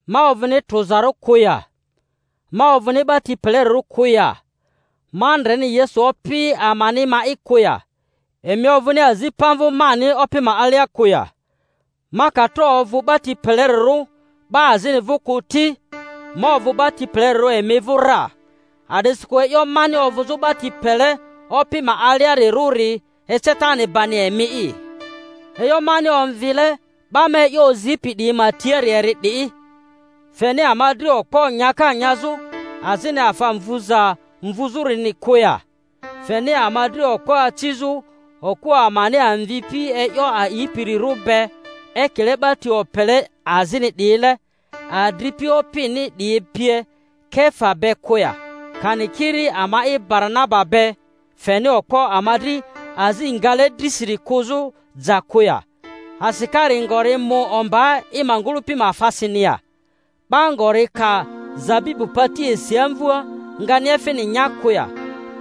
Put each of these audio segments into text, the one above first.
Ma ovᴜni trᴜzarᴜ kᴜ ya? Ma ovᴜni 'ba ti pelerirᴜ kᴜ ya? Ma ndreni Yesu Opi amani ma'i kᴜ ya? Emi ovᴜni azi pamvᴜ mani Opi ma alia kᴜ ya? Ma ka tro ovᴜ 'ba ti pelerirᴜ 'ba azini vᴜ kᴜ ti, ma ovᴜ 'ba ti pelerirᴜ emi vᴜ ra; a'disikᴜ e'yo mani ovᴜzᴜ 'ba ti pele Opi ma aliarirᴜri, ecetani bani emi'i. E'yo mani omvile 'ba ma e'yo ozipi 'diyi ma tiari eri 'di. Feni ama dri okpo nyaka nyazᴜ azini afa mvuza mvuzᴜrini kᴜ ya? Feni ama dri okpo acizᴜ okᴜ amani amvipi e'yo a'ipirᴜri be, ekile 'ba ti opele azini 'diyile, adripi Opini 'diyi pie, Kefa be kᴜ ya? Kani kiri ama'i Baranaba be, feni okpo ama dri azi ngale drisiri kᴜzᴜ ja kᴜ ya? Asikari ngori mu ombaa i ma ngᴜlᴜpi ma afasini ya? 'Ba ngori ka zabibu pati esi amvua, ngani efini nya kᴜ ya?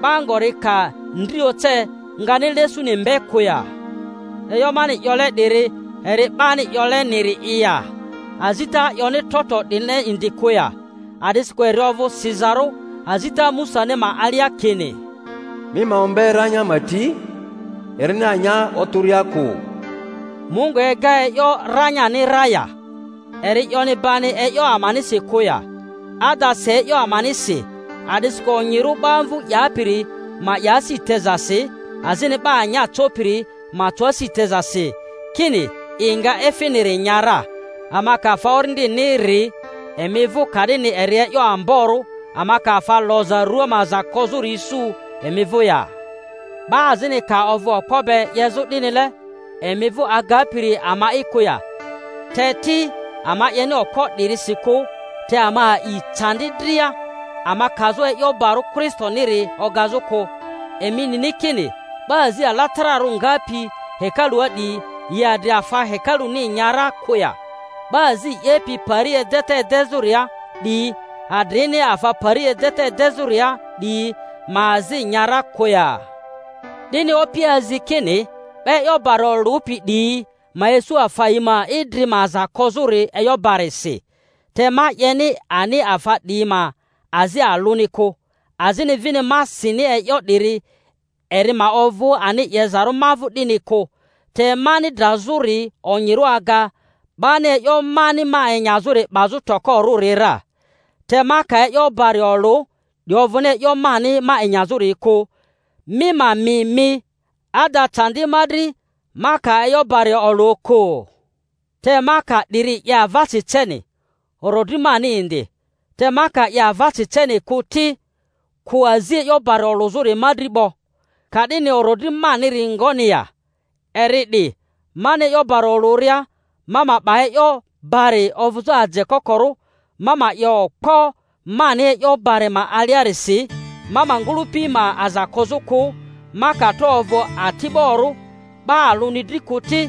'Ba ngori ka ndri oce, ngani lesuni mbe kᴜ ya? E'yo mani 'yole 'diri eri 'bani 'yoleniri'i ya? Azita 'yoni trotro 'dinile indi kᴜ ya? A'disikᴜ eri ovᴜ sizarᴜ azita Musani ma alia kini, Mi ma ombe ranya ma ti, erini anya otᴜria kᴜ. Mungu ega e'yo ranyani ra ya? Eri 'yoni bani e'yo amanisi kᴜ ya? Ada, si e'yo amanisi, a'disikᴜ onyirᴜ 'ba amvu 'yapiri ma 'ya asi tezasi, azini 'ba anya copiri ma co asi tezasi, kini, i nga efiniri nya ra. Ama ka afa orindini ri emi vᴜ, ka'dini eri e'yo amboro ama ka afa loza rᴜa ma aza kozori isu emi vᴜ ya? 'Ba azini ka ovᴜ okpo be 'yezᴜ 'dinile emi vᴜ, agapiri ama'i kᴜ ya? Te ti, ama 'yeni okpo 'dirisi kᴜ, te ama a'i candi dria, ama kazᴜ e'yo barᴜ Kristoniri ogazᴜ kᴜ Emi nini kini 'ba azi alatararᴜ ngapi hekalua 'diyi, yi adri afa hekaluni nya ra kᴜ ya? 'Ba azi 'yepi pari edeta edezᴜria 'diyi adrini afa pari edeta edezᴜria 'diyi ma azi nya ra kᴜ ya? 'Dini Opi azi kini 'ba e'yo bari olᴜpi 'diyi ma isu afa yi ma idri ma aza kozᴜri e'yo barisi. Te ma 'yeni ani afa 'diyi ma azi alᴜni kᴜ, azini vini ma sini e'yo 'diri eri ma ovᴜ ani 'yezarᴜ ma vᴜ 'dini kᴜ. Te mani drazᴜri onyirᴜ aga 'bani e'yo mani ma enyazᴜri 'bazᴜ tokorᴜri ra. Te ma ka e'yo bari olᴜ, 'di ovᴜni e'yo mani ma enyazᴜri kᴜ; mi ma mi mi; ada, candi ma dri ma ka e'yo bari olᴜ kᴜ! Te ma ka 'diri 'ye avasi ceni, orodri mani indi; te ma ka 'ye avasi ceni kᴜ ti, kᴜ azi e'yo bari olᴜzᴜri ma dri 'bo. Ka'dini orodri maniri ngoni ya? Eri 'di: mani e'yo bari olᴜria, ma ma 'ba e'yo bari ovᴜzᴜ aje kokorᴜ, ma ma 'ye okpo mani e'yo bari ma alia-risi ma ma ngᴜlᴜpi ma aza kozᴜ kᴜ. Ma ka tro ovᴜ ati'borᴜ 'ba alᴜni dri kᴜ ti,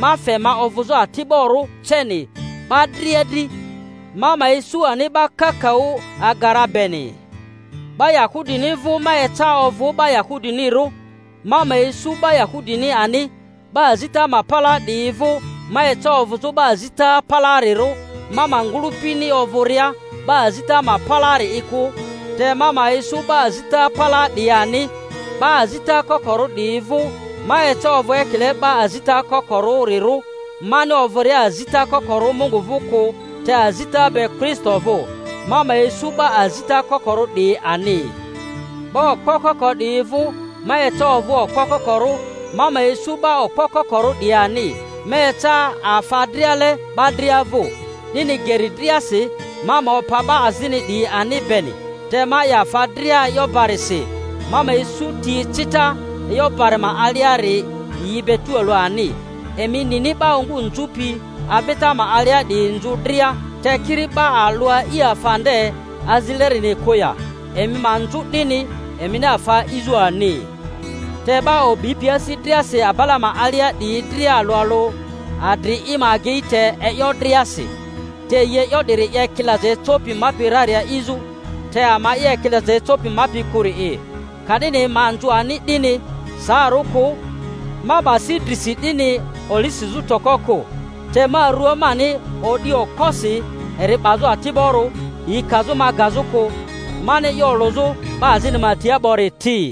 ma fe ma ovᴜzᴜ ati'borᴜ ceni 'ba dria dri, ma ma isᴜ ani 'ba kakaᴜ aga ra beni. 'Ba Yahudini vᴜ ma eca ovᴜ 'ba Yahudinirᴜ, ma ma isu 'ba Yahudini ani; 'ba azita ma palaa 'diyi vᴜ ma eca ovᴜzᴜ 'ba azita palaarirᴜ—ma ma ngᴜlᴜpini ovᴜria 'ba azita ma palaa-ri'i kᴜ—te ma ma isu 'ba azita palaa 'diyi ani. 'Ba azita kokorᴜ 'diyi vᴜ ma eca ovᴜ ekile 'ba azita koko-rᴜrirᴜ—mani ovᴜria azita kokorᴜ Mungu vᴜ kᴜ, te azita be Kristo vᴜ.—ma ma isu 'ba azita kokorᴜ 'diyi ani. 'Ba okpo koko 'diyi vᴜ ma eca ovᴜ okpo kokorᴜ, ma ma isu 'ba okpo kokorᴜ 'diyi ani. Ma eca afa driale 'ba dria vᴜ, 'dini geri driasi ma ma opa 'ba azini 'diyi ani beni. Te ma 'ye afa dria e'yo barisi, ma ma isu ti ecita e'yo bari ma aliari yi be tualᴜ ani. Emi nini 'ba ongu nzᴜpi avita ma alia 'diyi nzᴜ dria, te kiri 'ba alᴜ a'i afa nde azilerini kᴜ ya? Emi ma nzᴜ 'dini, emini afa a'izᴜ ani. Te 'ba o'bipi asi driasi abala ma alia 'diyi dria alᴜ alᴜ adri i ma agei te e'yo driasi. Te yi e'yo 'diri 'ye ekilaza ecopi mapi rari a'izᴜ, te ama'i ekilaza ecopi mapi kᴜri'i. Ka'dini ma nzᴜ ani 'dini saarᴜ kᴜ, ma 'ba si drisi 'dini oli sizᴜ toko kᴜ; te ma rua mani odi okposi eri 'bazᴜ ati'borᴜ, yi kazᴜ ma gazᴜ kᴜ, mani e'yo olᴜzᴜ 'ba azini tia 'bori ti.